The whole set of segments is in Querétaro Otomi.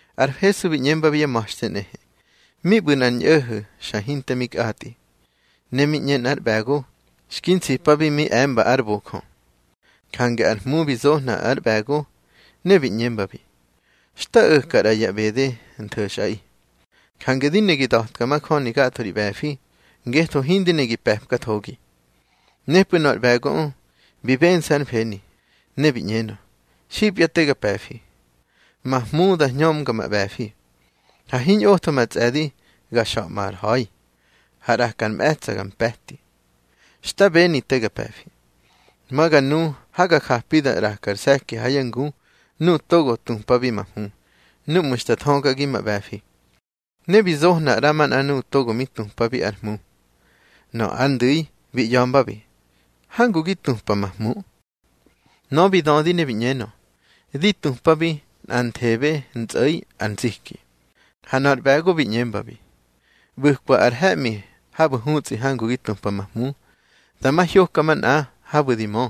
Ar Hesu bi ꞌñembabi yá ma̱xte nꞌehe: —Mi ꞌbu̱ nꞌar ñꞌo̱ho̱ xa hinte mi kꞌatꞌi. Ne mi ꞌñe nꞌar ꞌbe̱go, xki nsipabi mi e̱mba ár bojö. Jange ar hmu bi zohna ár ꞌbe̱go, ne bi ꞌñembabi: Xta o̱ka ꞌra ya ꞌbede ntho̱xꞌaꞌi. Jange di ne gi da̱tka majöni gatho ri ꞌbe̱fi, ngetho hindi ne gi pe̱pkathogi. Nepꞌu̱ nöꞌö ar ꞌbe̱goꞌö bi bense̱ hár mfeni, ne bi ꞌñenö: Xipya te ga pe̱fi. Ma hmu da hñömga ma ꞌbe̱fi, ha hiñꞌotho ma tsꞌe̱di ga xa̱ꞌmar ha̱i, ha ꞌraka ar mꞌe̱tsa̱ ga mpe̱ti. Xta beni te ga pe̱fi. Ma ga nu ha ga japi da ꞌrakar se̱ki ha yá ngu nuꞌu̱ togo tupabi ma hmu, núꞌmu̱ xta thögagi ma ꞌbe̱fi. Ne bi zohna ꞌramanꞌa nuꞌu̱ togo mi tupabi ár hmu. Nöꞌö ar ndu̱i bi ꞌya̱mbabi: Hangu gi tupa ma hmu. Nöꞌö bi dödi ne bi ꞌñenö: Di tupabi nꞌanthebe ntsꞌo̱i ar nziki. Ha nöꞌö ar ꞌbe̱go bi ꞌñembabi: ꞌBu̱kwa ar he̱ꞌmi habu̱ hutsꞌi hangu gi tupa ma hmu. Dama hyoka manꞌa habu̱ di mö,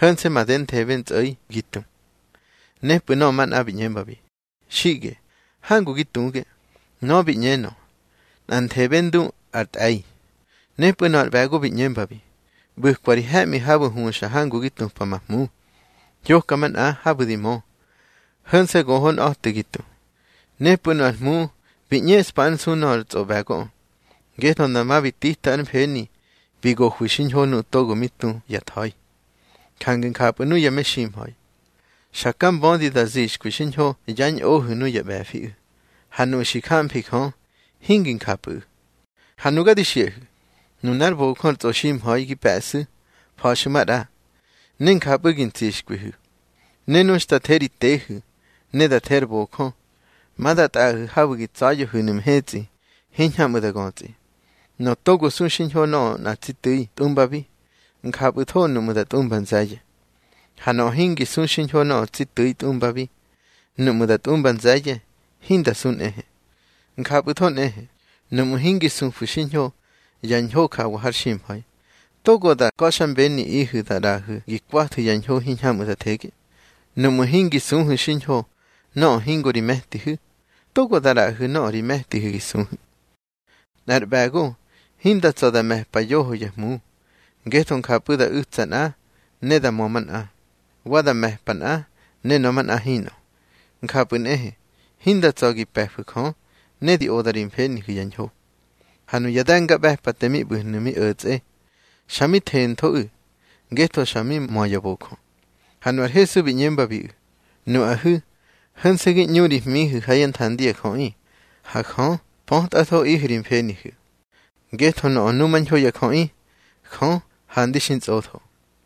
ho̱nse̱ madenthebe ntsꞌo̱i gi tu. Nepꞌu̱ nöꞌö manꞌa bi ꞌñembabi: Xiꞌge hangu gi tuge. Nöꞌö bi ꞌñenö: Nꞌanthebe ndu ar tꞌe̱i. Nepꞌu̱ nöꞌö ar ꞌbe̱go bi ꞌñembabi: ꞌBu̱kwa ri he̱ꞌmi habu̱ huxa hangu gi tupa ma hmu. Hyoka manꞌa habu̱ di mö, ho̱nse̱ gohonꞌa̱te gi tu. Nepꞌu̱ nu ár hmu bi ꞌñeꞌspa ár nsu nöꞌö ar tsꞌoꞌbe̱goꞌö, ngetho dama bi tita ár mfeni bi gohwi xiñho nuꞌu̱ togo mi tu ya tha̱i. Jange njapꞌu̱ nuya meximha̱i, xa ka mbödi da zixkwi xiñho yá ñꞌohu̱ nuyá ꞌbe̱fiꞌu̱, ha nuꞌu̱ xi jamfi Jö hingi njapꞌu̱ꞌu̱. Ha nuga di xiꞌahu̱, nunár bojö ar tsꞌoximha̱i gi pe̱ꞌsu̱, fa̱xu̱ maꞌra, ne njapꞌu̱ gi ntsixkwihu̱. Ne nu xta the ri tehu̱, ne da the ar bojö, ma da tꞌaꞌahu̱ habu̱ gi tsa̱ya̱hu̱nu̱ mhetsꞌi hiñhamꞌu̱ da götsꞌi. Nöꞌö togo su xiñho nöꞌö nꞌa tsi tu̱i tꞌumbabi, njapꞌu̱tho nuꞌmu̱ da tꞌumba nze̱ye̱. Ha nöꞌö hingi su xiñho nöꞌö tsi tu̱i tꞌumbabi, nuꞌmu̱ da tꞌumba nze̱ye̱, hinda su nꞌehe. Njapꞌu̱tho nꞌehe, nuꞌmu̱ hingi sufu̱ xiñho ya ñho jawa har ximha̱i, togo da ka̱xmbeniꞌihu̱ da ꞌraꞌahu̱ gi kwathu̱ ya ñho hiñhamꞌu̱ da thege. Nuꞌmu̱ hingi suhu̱ xiñho nöꞌö hingo ri me̱tihu̱, togo da ꞌraꞌahu̱ nöꞌö ri me̱tihu̱ gi suhu̱. Nꞌar ꞌbe̱go hinda tsa̱ da me̱pa yoho yá hmu, ngetho njapꞌu̱ da u̱tsa nꞌa, ne da mö manꞌa. Wa da me̱pa nꞌa, ne nöꞌö manꞌa hinꞌö. Njapꞌu̱ nꞌehe, hinda tsa̱ gi pe̱fu̱ Jö ne di oda ri mfenihu̱ ya ñho. Ha nuya de̱ngaꞌbe̱pate mi ꞌbu̱hnu̱ mi o̱tsꞌe, xa mi thenthoꞌu̱, ngetho xa mi mö ya bojö. Ha nu ar Hesu bi ꞌñembabiꞌu̱: —Nuꞌahu̱ ho̱nse̱ gi ꞌñu ri hmihu̱ ha yá nthandi ya jöꞌi. Ha Jö pötꞌathoꞌihu̱ ri mfenihu̱, ngetho nöꞌö numañho ya jöꞌi, Jö handi xi ntsꞌotho.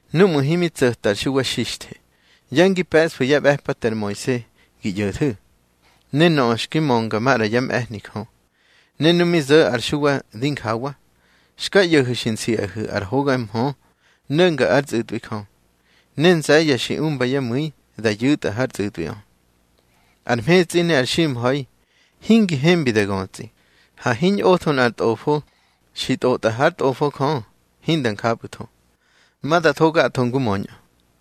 Núꞌmu̱ himi tso̱ta ar Xuwa Xixthe, ya ngi pe̱ꞌsfu̱ yá ꞌbe̱pate ar Moise ngi ꞌyo̱thu̱, ne nöꞌö xki mönga maꞌra yá mꞌe̱hni Jö. Ne nu mi zo̱ ar Xuwa dinjawa, xka ꞌyo̱hu̱ xi nsiꞌahu̱ ar hoga mhö no̱nga ár tsꞌu̱tꞌwi Jö, ne nze̱ye̱ xi umba yá mu̱i da yu̱tꞌa hár tsꞌu̱tꞌwiꞌö. Ar mhetsꞌi ne ar ximha̱i hingi hembi da götsꞌi. Ha hiñꞌotho nꞌar tꞌofo xi tꞌotꞌa hár Tꞌofo Jö, hinda njapꞌu̱tho. Ma da tho gatho ngu möñꞌö.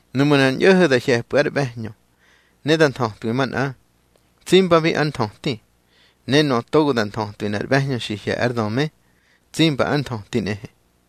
Nuꞌmu̱ nꞌar ñꞌo̱ho̱ da hye̱pꞌu̱ ár ꞌbe̱hñö ne da nthötwi manꞌa, tsimbabi ár nthöti. Ne nöꞌö togo da nthötwi nꞌar ꞌbe̱hñö xi hye̱ ár döme, tsimba ár nthöti nꞌehe.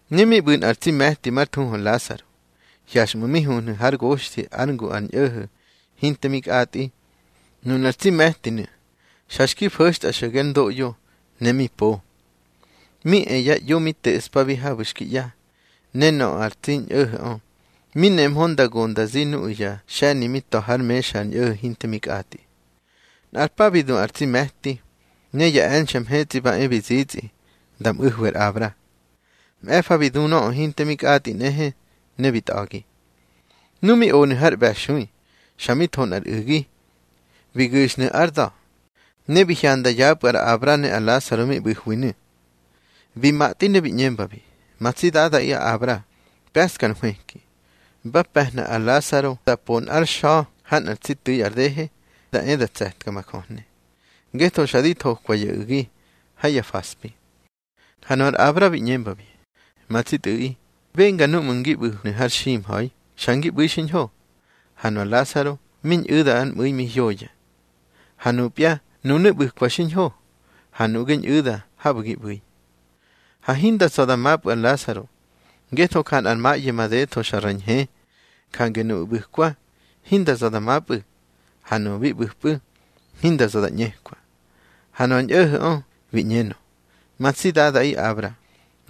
Ne mi ꞌbu̱ nꞌar tsi me̱ti már thuhu ar Lasaro, hyaxꞌmu̱ mi huhnu̱ hár goxthi ár ngu ar ñꞌo̱ho̱ hinte mi kꞌatꞌi. Nunar tsi me̱tinu̱ xa xki fo̱xtꞌa xo̱ge ár ndoꞌyo, ne mi po. Mi e ya ꞌyo mi teꞌspabi habu̱ xki ꞌya. Ne nöꞌö ar tsi ñꞌo̱ho̱ꞌö, mi nemhö nda go nda zi nuꞌu̱ ya xe̱ni mi ta̱ hár mexa ar ñꞌo̱ho̱ hinte mi kꞌatꞌi. Nꞌar pa bi du ar tsi me̱ti, ne ya e̱nxe̱ mhetsꞌi ba e bi zitsꞌi nda mꞌu̱hwi ar Abra. Mꞌe̱fa bi du nöꞌö hinte mi kꞌatꞌi nꞌehe, ne bi tꞌa̱gi. Nu mi onu̱ har ꞌbe̱xui, xa mi tho nꞌar u̱gi. Bi gu̱xnu̱ ár da̱, ne bi hyanda yapꞌu̱ ar Abra ne ar Lasaro mi ꞌbu̱hwinu̱. Bi matꞌi ne bi ꞌñembabi: Ma tsi dadaꞌi Abra, pe̱ꞌska ar nhwëki. Ba pe̱hna ar Lasaro da po nꞌár xa̱ ha nꞌar tsi tu̱i ar dehe, da e da tse̱tka ma jöhne. Ngetho xa di thokwa ya u̱gi ha ya faspi. Ha nu ar Abra bi ꞌñembabi: Ma tsi tꞌu̱ꞌi, benga núꞌmu̱ ngi ꞌbu̱hnu̱ har ximha̱i, xa ngi ꞌbu̱i xiñho, ha nu ar Lasaro mi ñꞌu̱da ár mꞌu̱i mi hyoya. Ha nupya, nunu̱ ꞌbu̱kwa xiñho, ha nuꞌge ñꞌu̱da habu̱ gi ꞌbu̱i. Ha hinda tsa̱ da mapꞌu̱ ar Lasaro, ngetho ja nꞌar maꞌye madetho xa ra ñhe. Jange nuꞌu̱ ꞌbu̱kwa, hinda za̱ da mapꞌu̱, ha nuꞌu̱ bi ꞌbu̱pꞌu̱, hinda za̱ di ꞌñekwa. Ha nöꞌö ar ñꞌo̱ho̱ꞌö bi ꞌñenö: Ma tsi dadaꞌi Abra,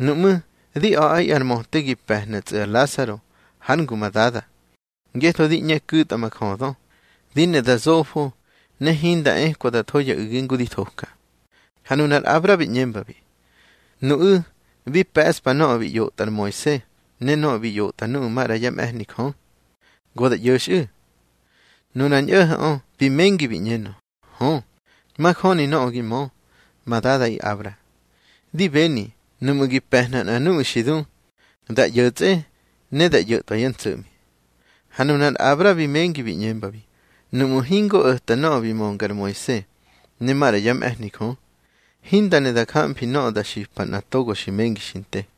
nuꞌmú̱, di a̱ꞌa ar möte gi pe̱hnatsꞌu̱ ar Lasaro hár ngu ma dada. Ngetho di ꞌñe ku̱tꞌa ma jödö, di ne da zofo ne hinda ekwa da tho ya u̱gi ngu di thoka. Ha nunar Abra bi ꞌñembabi: Nuꞌu̱ bi pe̱ꞌspa nöꞌö bi ꞌyotꞌa ar Moise ne nöꞌö bi ꞌyotꞌa nuꞌu̱ maꞌra yá mꞌe̱hni Jö. Go da ꞌyo̱xꞌu̱. Nunar ñꞌo̱ho̱ꞌö bi mengi bi ꞌñenö: Hö, majöni nöꞌö gi mö, ma dadaꞌi Abra. Di beni, nuꞌmu̱ gi pe̱hna nꞌa nuꞌu̱ xi du, da ꞌyo̱tsꞌe ne da ꞌyo̱tꞌwa yá ntso̱ꞌmi. Ha nunar Abra bi mengi bi ꞌñembabi: Nuꞌmu̱ hingo o̱ta nöꞌö bi mönga ar Moise ne maꞌra yá mꞌe̱hni Jö, hinda ne da jamfi nöꞌö da xipa nꞌa togo xi mengi xi nte.